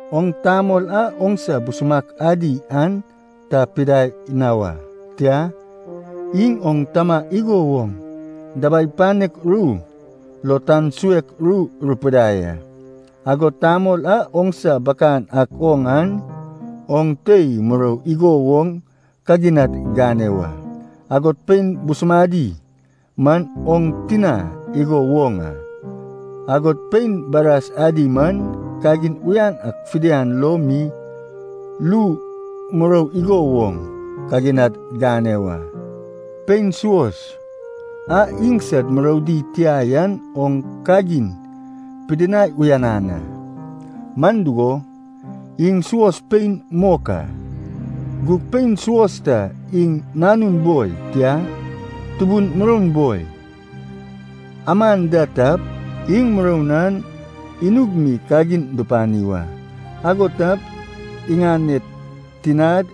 Oŋ tamol a oŋsa busumak adi an ta pidai na wa, tia, iŋ oŋ tama igo woŋ dabai panek ru lo tan suek ru rupidai a. Agod tamol a oŋsa bakan ak oŋ an, oŋ tei murou igo woŋ kaginad gane wa. Agod pein busumadi man oŋ tina igo woŋ a. Agod pein baras adi man kagin uyan ak fidian lo mi lu murou igo woŋ kaginad gane wa. Pein suos a iŋsad muroudi tia yan oŋ kagin pidinai uyanan a, man dugo, iŋ suos pein mok a. Gug pein suos ta iŋ nanun boi, tia, tubun muroun boi, aman da tap, iŋ muroun an inug mi kagin dupani wa. Ago tap, iŋaned tinad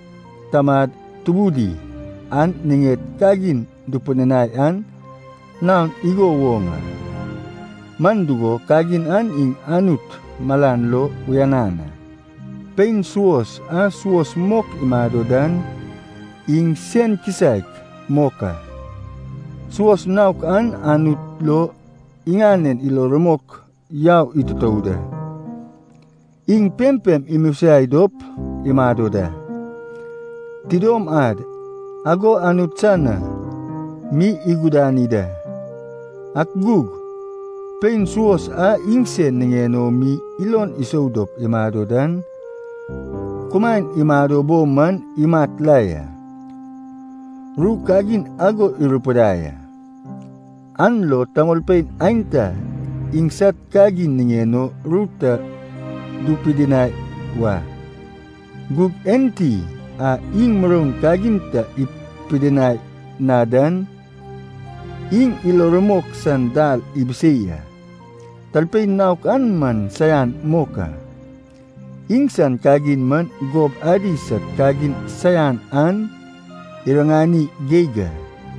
tamad tubudi an iŋaned kagin dupidinai an naon igo woŋ a, man dugo, kagin an iŋ Anut malan lo uyanan a. Pein suos a suos mok imado dan iŋ sen kisaek mok a. Suos naok an Anut lo iŋanen ilo rumok yau itutou da. Iŋ pempem imosiai dop imado da, tidom ad ago Anut san na mi igudani da. Ak gug, pein suos a iŋsen niŋen o mi ilon isou dop imado dan, kumaen imado bo man imat la ya. Ru kagin ago rupidai a. An lo tamolpein aenta iŋsad kagin niŋen o ru ta dupidinai wa. Gug enti a iŋ muroun kagin ta ipidinai na dan, iŋ ilo rumok san dal ibisei a. Talpein naok an man saian mok a. Iŋsan kagin man gob adi sad kagin saian an iriŋani geig a.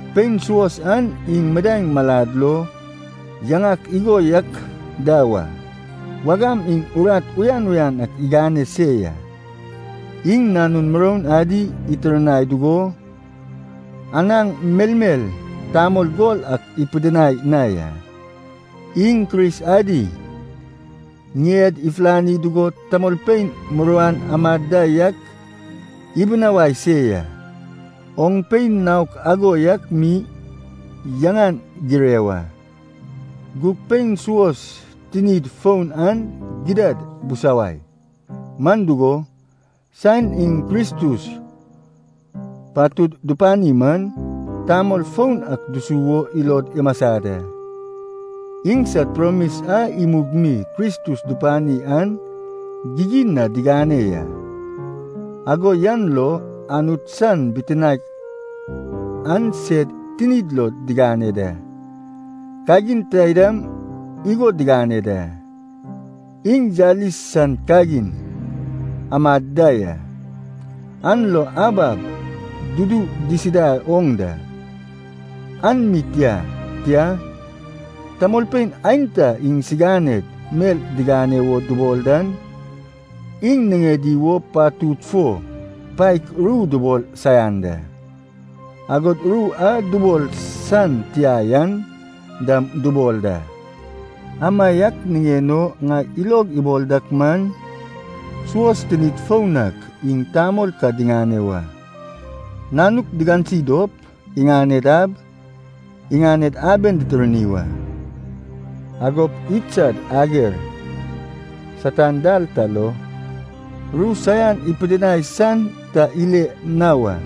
Pein suos an iŋ midaeŋ malad lo yaŋak igo yak da wa. Wagam iŋ urat uyan uyan ak igane se ya. Iŋ nanun muroun adi itirnai dugo, anaŋ melmel tamol gol ak ipidinai na ya. Iŋ Kris adi ŋied ifulani dugo, tamolpein muruan amad da yak ibinawai se ya. Oŋ pein naok ago yak mi yaŋan gire wa. Gug pein suos tinid foun an gidad busawai. Man dugo, saen iŋ Kristus patud dupani man, tamol foun ak dusu wo ilod imasa da. Iŋsad promis a imug mi Kristus dupani an gigin na digane ya, ago yan lo Anut san bitinaek an sed tinid lo digane da. Kagin taidam igo digane da. Iŋ yalis san kagin amad da ya, an lo ab ab dudu disida oŋ da. An mi tia, tia, tamolpein aenta iŋsiganed mel digane wo dubol dan, iŋ niŋedi wo patud fo paek ru dubol saian da, agod ru a dubol san tia yan dam dubol da. Amaiak niŋen o ŋai ilog ibol dak man, suos tinid foun ak iŋ tamol ka diŋane wa, nanuk digansi dop, iŋaned ab, iŋaned abed ditirni wa. Agop idsad ager Satan dal ta lo ru saian ipidinai san ta ile na wa.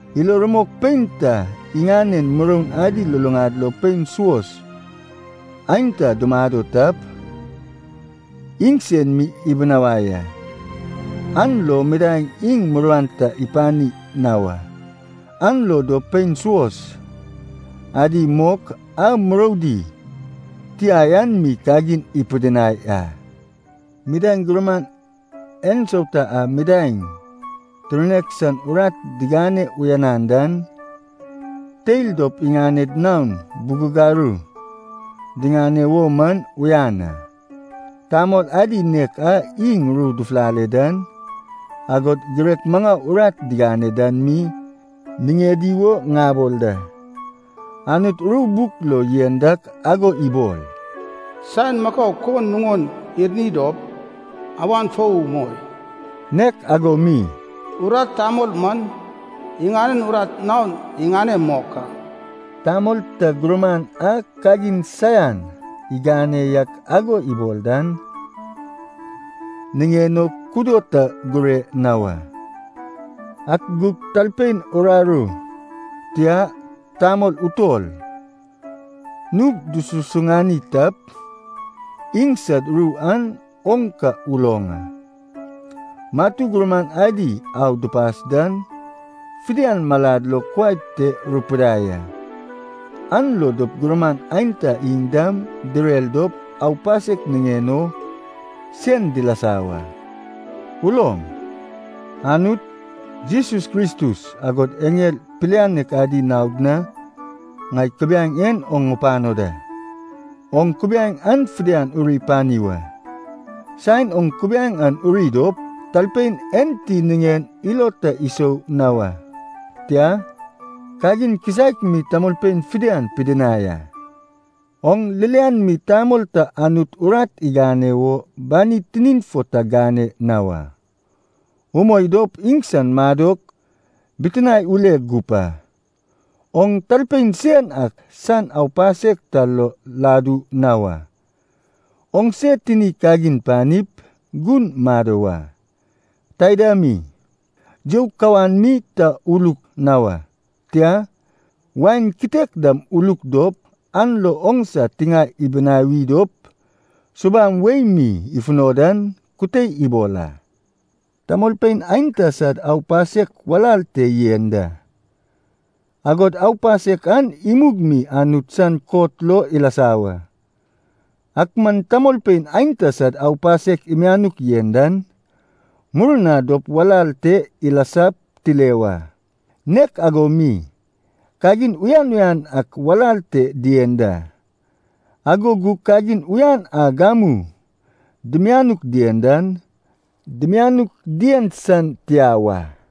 Ilo rumok pein ta iŋanen muroun adi luluŋad lo pein suos aenta dumado tap, iŋsen mi ibinawai a. An lo midaeŋ iŋ muruan ta ipani na wa. An lo dop pein suos adi mok, a muroudi tia yan mi kagin ipidinai a. Midaeŋ gurman ensauta a midaeŋ tirnek san urat digane uyanan dan, teil dop iŋaned naon bugagaru diŋane wo man uyan a. Tamol adi nek a iŋ ru dufulale dan, agod girek maŋau urat digane dan mi niŋedi wo ŋabol da. Anut ru buk lo yen dak ago ibol, “Saen makau kon nuŋon irni dop, awan fou umoi.” Nek ago mi, “Urat tamol man, iŋanen urat naon iŋane mok a.” Tamol ta gurman a kagin saian igane yak ago ibol dan, niŋen o kudo ta gure na wa. Ak gug talpein uraru, tia, tamol utol, nug dususuŋani tap, iŋsad ru an oŋ ka uloŋ a. Matu gurman adi au dupas dan, fidian malad lo kuai te rupidai a. An lo dop gurman aenta iŋ dam direr dop aupasek niŋen o sen dilasa wa. Uloŋ, Anut, Jesus Kristus, agod eŋel pilianek adi naod na ŋai kubiaeŋ en oŋ ŋupano da. Oŋ kubiaeŋ an fidian uri pani wa. Saen oŋ kubiaeŋ an uri dop, talpein enti niŋen ilo ta isou na wa, tia, kagin kisaek mi tamolpein fidian pidinai a. Oŋ ririan mi tamol ta Anut urat igane wo bani tinin fo ta gane na wa. Moi dop iŋsan madok bitinae ule gup a. Oŋ talpein sen ak san aupasek ta lo ladu na wa. Oŋse tini kagin panip, gun mado wa. Taida mi, you kawan mi ta uluk na wa. Tia, wain kitek dam uluk dop, an lo oŋsa tiŋae ibinawi dop subam wei mi ifuno dan kute ibol a. Tamolpein aenta sad aupasek walal te yen da, agod aupasek an imug mi Anut san kot lo ilasa wa. Ak man tamolpein aenta sad aupasek imianuk yen dan, murna dop walal te ilasap tile wa. Nek ago mi, kagin uyan uyan ak walal te dien da. Ago gug kagin uyan a gamu dimianuk dien dan, dimianuk dien san tia wa.